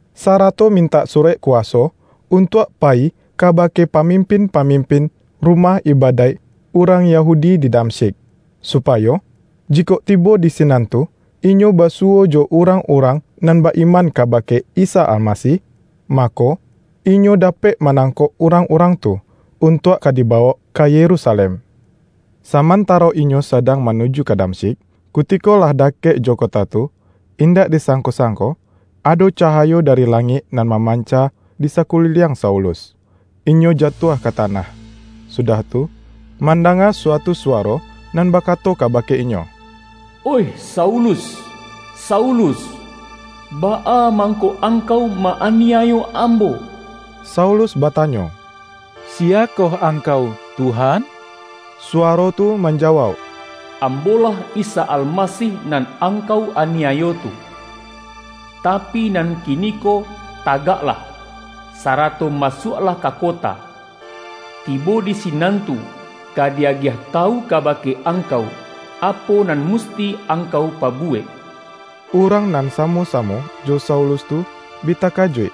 sarato mintak surek kuwaso, untuak payi kabake pamimpin-pamimpin rumah ibadaik urang Yahudi di Damsyik, supayo, jikok tibo di sinan tu inyo basuwo jo urang-urang nan ba-iman kabake Isa Almasih, mako, inyo dapek manangkok urang-urang tu, untuak ka dibawok ka Yerusalem. Samantaro inyo sadang manuju ka Damsyik, kutiko lah dakek jo kota tu, indak disangko-sangko ado cahayo dari langik nan mamanca di sakuliliang Saulus. Inyo jatuah ka tanah, sudah tu, mandanga suatu suwaro nan bakato kabake inyo,”Oih Saulus, Saulus! Baa mangko angkau ma-aniayo Ambo?” Saulus batanyo,”Siyakoh Angkau, Tuhan?” Suwaro tu manjawauk ’Ambo-lah Isa Almasih, nan angkau aniayo tu. Tapi, nan kiniko tagaklah, sarato masuaklah ka kota. Tibo di sinan tu, ka di-agiah tawu kabake angkau, apo nan musti angkau pabuwek.” Urang nan samo-samo jo Saulus tu bi takajuik,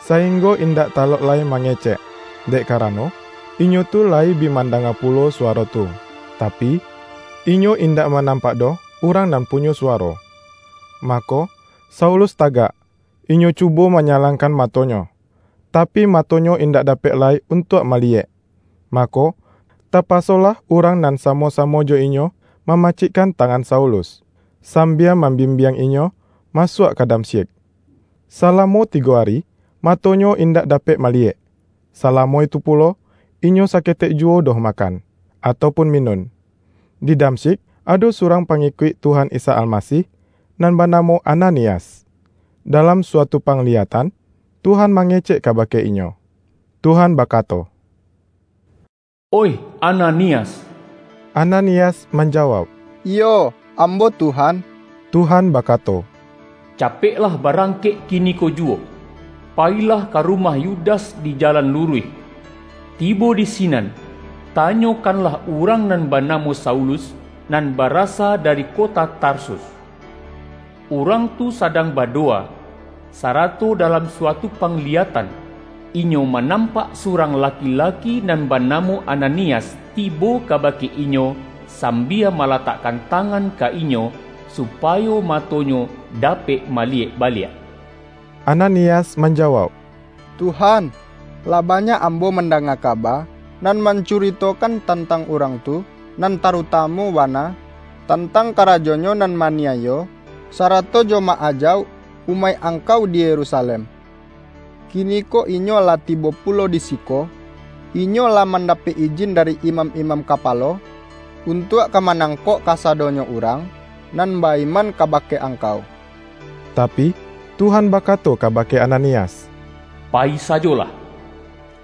sainggo indak talok lai mangecek; dek karano, inyo tu layi bi mandanga pulo suwaro tu, tapi, inyo indak manampak doh urang nan punyo suwaro. Mako, Saulus tagak, inyo cubo manyalangkan matonyo, tapi matonyo indak dapek lai untuak maliyek. Mako, tapasolah urang nan samo-samo jo inyo mamacikkan tangan Saulus, sambia mambimbiang inyo masuak ka Damsyik. Salamo tigo ari, matonyo indak dapek maliyek, salamo itu pulo, inyo indak saketek juwo doh makan, atau pun minun. Di Damsyik, ado surang pangikuik Tuhan Isa Almasih, nan banamo Ananias. Dalam suatu pangliyatan, Tuhan mangecek kabake inyo. Tuhan bakato,”Oih Ananias!” Ananias manjawauk,”Iyo, ambo Tuhan.” Tuhan bakato,”Capeklah ba-rangkek kiniko juwo. Payilah ka rumah Yudas di Jalan Luruih. Tibo di sinan, tanyokanlah urang nan banamo Saulus, nan barasa dari kota Tarsus. Urang tu sadang badowa, sarato dalam suatu pangliyatan, inyo manampak surang laki-laki, nan banamo Ananias, tibo kabake inyo sambia malatakkan tangan ka inyo, supayo matonyo dapek maliyek baliak.” Ananias manjawauk,”Tuhan, lah banyak ambo mandanga kaba, nan mancuritokan tantang urang tu, nan tarutamu bana tantang karajonyo nan ma-aniayo, sarato jo ma-ajauk umaik Angkau di Yerusalem. Kiniko inyo lah tibo pulo di siko, inyo lah mandapek ijin dari imam-imam kapalo, untuak ka manangkok kasadonyo urang nan ba-iman kabake Angkau.” Tapi, Tuhan bakato kabake Ananias,”Payi sajolah!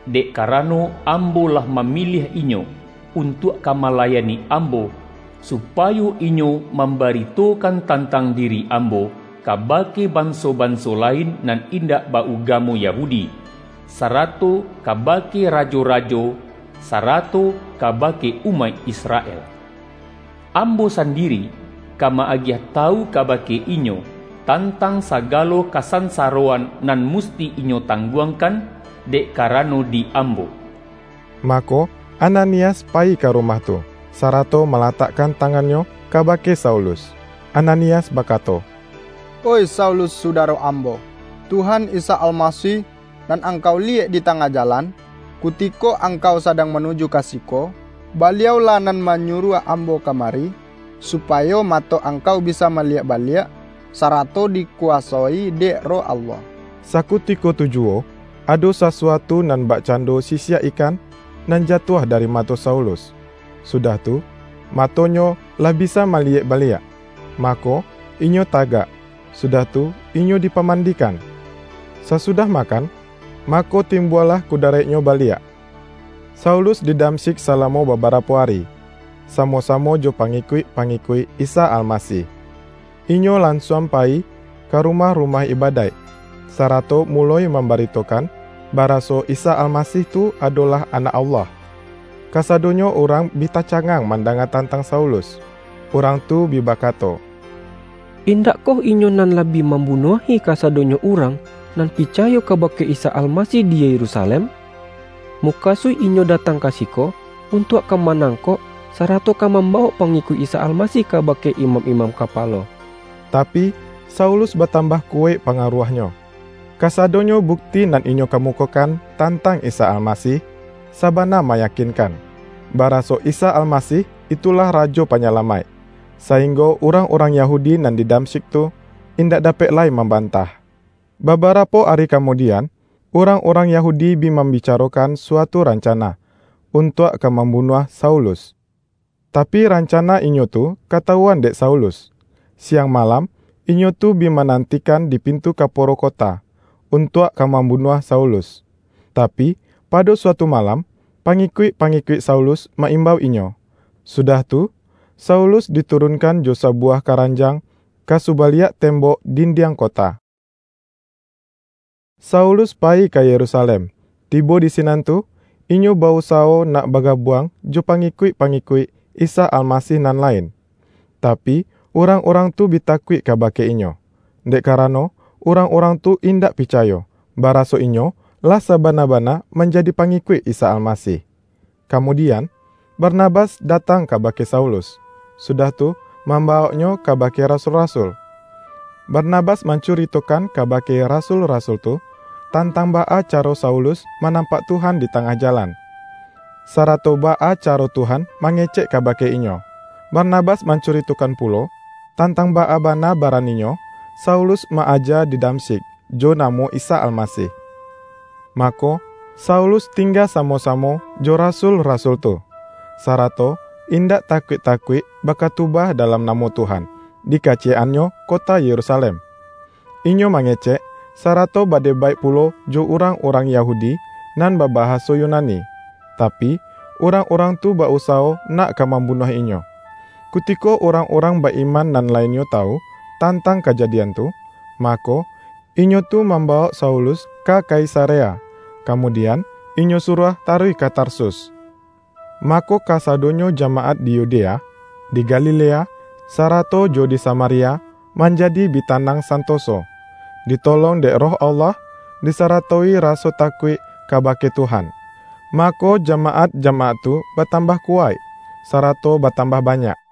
Dek karano, Ambo lah mamiliah inyo, untuak ka malayani Ambo, supayo inyo mambaritokan tantang diri Ambo, kabake banso-banso lain nan indak ba-ugamo Yahudi, sarato kabake rajo-rajo, sarato kabake umaik Israel. Ambo sandiri ka ma-agiah tawu kabake inyo, tantang sagalo kasansaroan nan musti inyo tangguangkan, dek karano di Ambo.” Mako, Ananias payi ka rumah tu, sarato malatakkan tangannyo kabake Saulus. Ananias bakato,”Oih Saulus sudaro ambo, Tuhan Isa Almasih nan angkau liyek di tangah jalan, kutiko angkau sadang manuju ka siko, Baliau-lah nan manyuruah ambo ka mari, supayo mato angkau bisa maliyek baliak, sarato dikuwasoi dek Roh Allah.” Sakutiko tu juwo, ado sasuatu nan bakcando sisiak ikan, nan jatuah dari mato Saulus, sudah tu, matonyo lah bisa maliyek baliak. Mako, inyo tagak, sudah tu inyo dipamandikan. Sasudah makan, mako, timbualah kudaraiknyo baliak. Saulus di Damsyik salamo babarapo ari, samo-samo jo pangikuik-pangikuik Isa Almasih. Inyo lansuang payi ka rumah-rumah ibadaik, sarato muloi mambaritokan, baraso Isa Almasih tu adolah Anak Allah. Kasadonyo urang bi tacangang mandanga tantang Saulus. Urang tu bi bakato,”Indakkoh inyo nan lah bi mambunuahi kasadonyo urang nan picayo kabake Isa Almasih di Yerusalem? Mukasuik inyo datang ka siko, untuak ka manangkok, sarato ka mambawok pangikuik Isa Almasih kabake imam-imam kapalo!” Tapi, Saulus batambah kuwaik pangaruahnyo. Kasadonyo bukti nan inyo kamukokan tantang Isa Almasih, sabana mayakinkan, baraso Isa Almasih itulah Rajo Panyalamaik, sainggo urang-urang Yahudi nan di Damsyik tu, indak dapek lai mambantah. Babarapo ari kamudian, urang-urang Yahudi bi mambicarokan suatu rancana, untuak ka mambunuah Saulus. Tapi, rancana inyo tu katawuan dek Saulus. Siang malam inyo tu bi manantikan di pintu kaporo kota, untuak ka mambunuah Saulus. Tapi, pado suatu malam, pangikuik-pangikuik Saulus ma-imbau inyo, sudah tu, Saulus diturunkan jo sabuwah karanjang ka subaliak tembok dindiang kota. Saulus payi ka Yerusalem, tibo di sinan tu, inyo ba-usawo nak bagabuang jo pangikuik-pangikuik Isa Almasih nan lain. Tapi, urang-urang tu bi takuik kabake inyo, dek karano urang-urang tu indak picayo, baraso inyo lah sabana-bana manjadi pangikuik Isa Almasih. Kamudian, Barnabas datang kabake Saulus, sudah tu mambawoknyo kabake rasul-rasul. Barnabas mancuritokan kabake rasul-rasul tu, tantang baa caro Saulus manampak Tuhan di tangah jalan, sarato baa caro Tuhan mangecek kabake inyo. Barnabas mancuritokan pulo, tantang baa bana baraninyo Saulus ma-aja di Damsyik, jo namo Isa Almasih. Mako, Saulus tingga samo-samo jo rasul-rasul tu, sarato indak takuik-takuik bakatubah dalam namo Tuhan, di kaciyek-annyo kota Yerusalem. Inyo mangecek, sarato badebaik pulo jo urang-urang Yahudi nan babahaso Yunani, tapi, urang-urang tu ba-usawo nak ka mambunuah inyo. Kutiko urang-urang ba-iman nan lainnyo tawu, tantang kajadian tu, mako, inyo tu mambawok Saulus ka Kaisarea, kamudian, inyo suruah taruih ka Tarsus. Mako, kasadonyo jamaat di Yudea, di Galilea, sarato jo di Samaria, manjadi bi tanang santoso. Ditolong dek Roh Allah, disaratoi raso takuik kabake Tuhan, mako, jamaat-jamaat tu batambah kuwaik, sarato batambah banyak.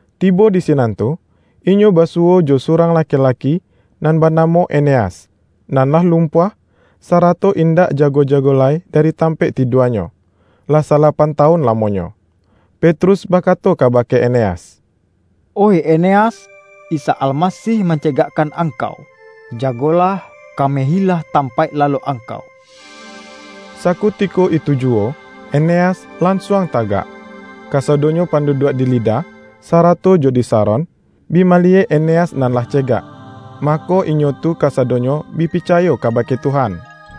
Tibo di sinan tu, inyo basuwo jo surang laki-laki, nan banamo Eneas, nan lah lumpuah, sarato indak jago-jago lai dari tampaik tiduanyo, lah salapan tawun lamonyo. Petrus bakato kabake Eneas,”Oih Eneas, Isa Almasih mancegakkan angkau. Jagolah, kamehilah tampaik lalok angkau.” Sakutiko itu juwo, Eneas lansuang tagak. Kasadonyo panduduak di Lida, sarato jo di Saron, bi maliyek Eneas nan lah cegak, mako, inyo tu kasadonyo bi picayo kabake Tuhan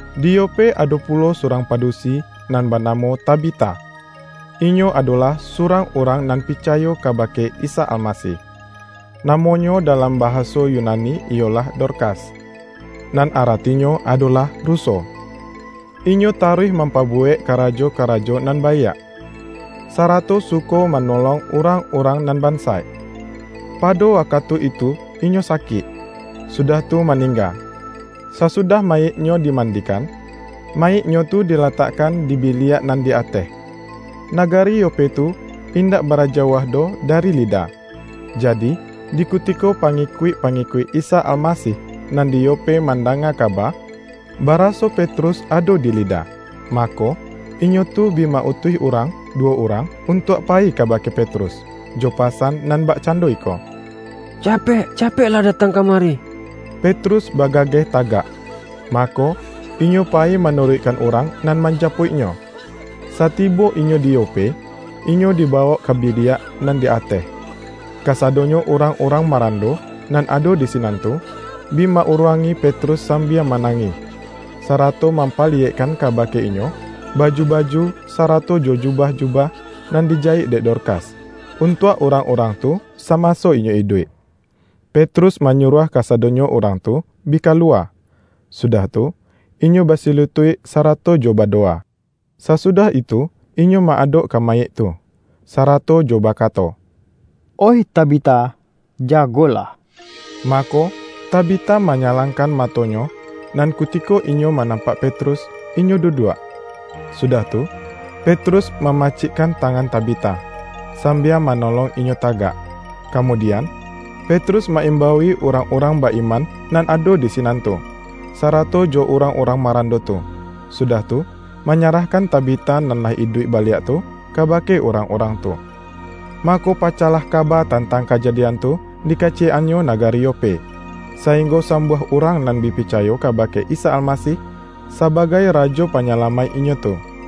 Di Yope ado pulo surang padusi nan banamo Tabita. Inyo adolah surang urang nan picayo kabake Isa Almasih. (Namonyo dalam bahaso Yunani iyolah Dorkas, nan aratinyo adolah ruso.) Inyo taruih mampabuwek karajo-karajo nan baiak, sarato suko manolong urang-urang nan bansaik. Pado wakatu itu inyo sakik, sudah tu maningga. Sasudah mayiknyo dimandikan, mayiknyo tu dilatakkan di biliak nan di ateh. Nagari Yope tu indak bara jauah doh dari Lida. Jadi, di kutiko pangikuik-pangikuik Isa Almasih nan di Yope mandanga kaba, baraso Petrus ado di Lida, mako, inyo tu bi ma-utuih urang duwo urang, untuak payi kabake Petrus, jo pasan nan bakcando iko,”Capek-capeklah datang kamari.” Petrus bagageh tagak, mako, inyo payi manuruikkan urang nan manjapuiknyo. Satibo inyo di Yope, inyo dibawok ka biliak nan di ateh. Kasadonyo urang-urang marando nan ado di sinan tu, bi ma-uruangi Petrus sambia manangih, sarato mampaliyekkan kabake inyo, baju-baju, sarato jo jubah-jubah nan dijayik dek Dorkas, untuak urang-urang tu samaso inyo iduik. Petrus manyuruah kasadonyo urang tu bi kaluwa, sudah tu, inyo basilutuik sarato jo badowa. Sasudah itu inyo ma-adok ka mayik tu, sarato jo bakato,”Oih Tabita, jagolah!” Mako, Tabita manyalangkan matonyo, nan kutiko inyo manampak Petrus, inyo duduak. Sudah tu, Petrus mamacikkan tangan Tabita, sambia manolong inyo tagak. Kamudian, Petrus ma-imbaui urang-urang ba-iman nan ado di sinan tu, sarato jo urang-urang marando tu, sudah tu, manyarahkan Tabita nan lah iduik baliak tu, kabake urang-urang tu. Mako pacahlah kaba tantang kajadian tu di kaciyek-annyo nagari Yope, sainggo sambuah urang nan bi picayo kabake Isa Almasih, sabagai Rajo Panyalamaik inyo tu.